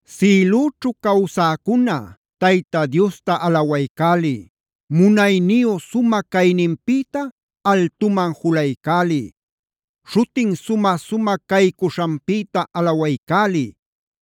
Sïlüćhu cawsäcuna Tayta Diosta alawaycäliy. Munayniyu sumä cayninpïta altuman julaycäliy. Śhutin sumä-sumä caycuśhanpïta alawaycäliy.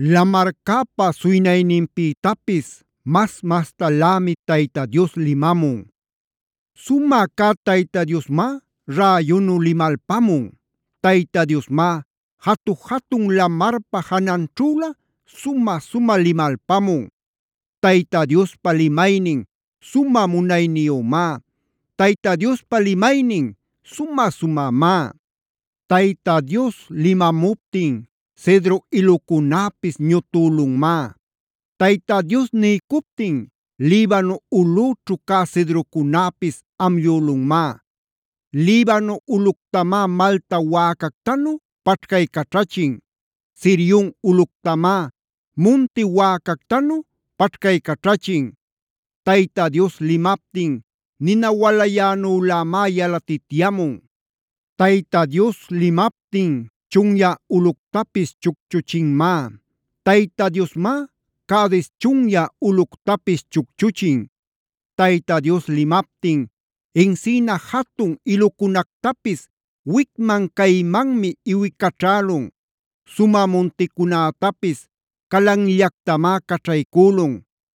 Lamarcäpa suynayninpïtapis mas-mastalämi Tayta Dios limamun. Sumä cä Tayta Diosmá räyunu limalpamun. Tayta Diosmá jatu-jatun lamarpa jananćhülä sumä-sumä limalpamun. Tayta Diospa limaynin sumä munayniyümá. Tayta Diospa limaynin sumä-sumämá. Tayta Dios limamuptin cedro ilucunäpis ñutülunmá. Tayta Dios niycuptin Libano ulꞌüćhu cä cedrocunäpis amllülunmá. Libano ulꞌuctamá malta wäcactanu paćhcaycaćhachin. Sirionb ulꞌuctamá munti wäcactanu paćhcaycaćhachin. Tayta Dios limaptin nina walayänülamá yalatityamun. Tayta Dios limaptin chunyä ulꞌuctapis chucchuchinmá. Tayta Diosmá Cades chunyä ulꞌuctapis chucchuchin. Tayta Dios limaptin encina jatun ilucunactapis wicman caymanmi iwicaćhälun. Sumä munticunätapis calanllactamá caćhaycülun.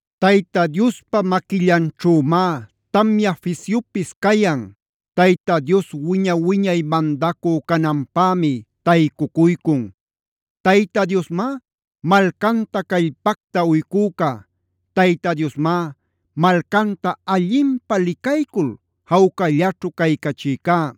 Tayta Diospa maquillanćhümá tamya fisyupis cayan. Tayta Dios wiña-wiñay mandacü cananpämi taycucuycun. Tayta Diosmá malcanta callpacta uycücá. Tayta Diosmá malcanta allinpä licaycul jawcallaćhu caycachïcá.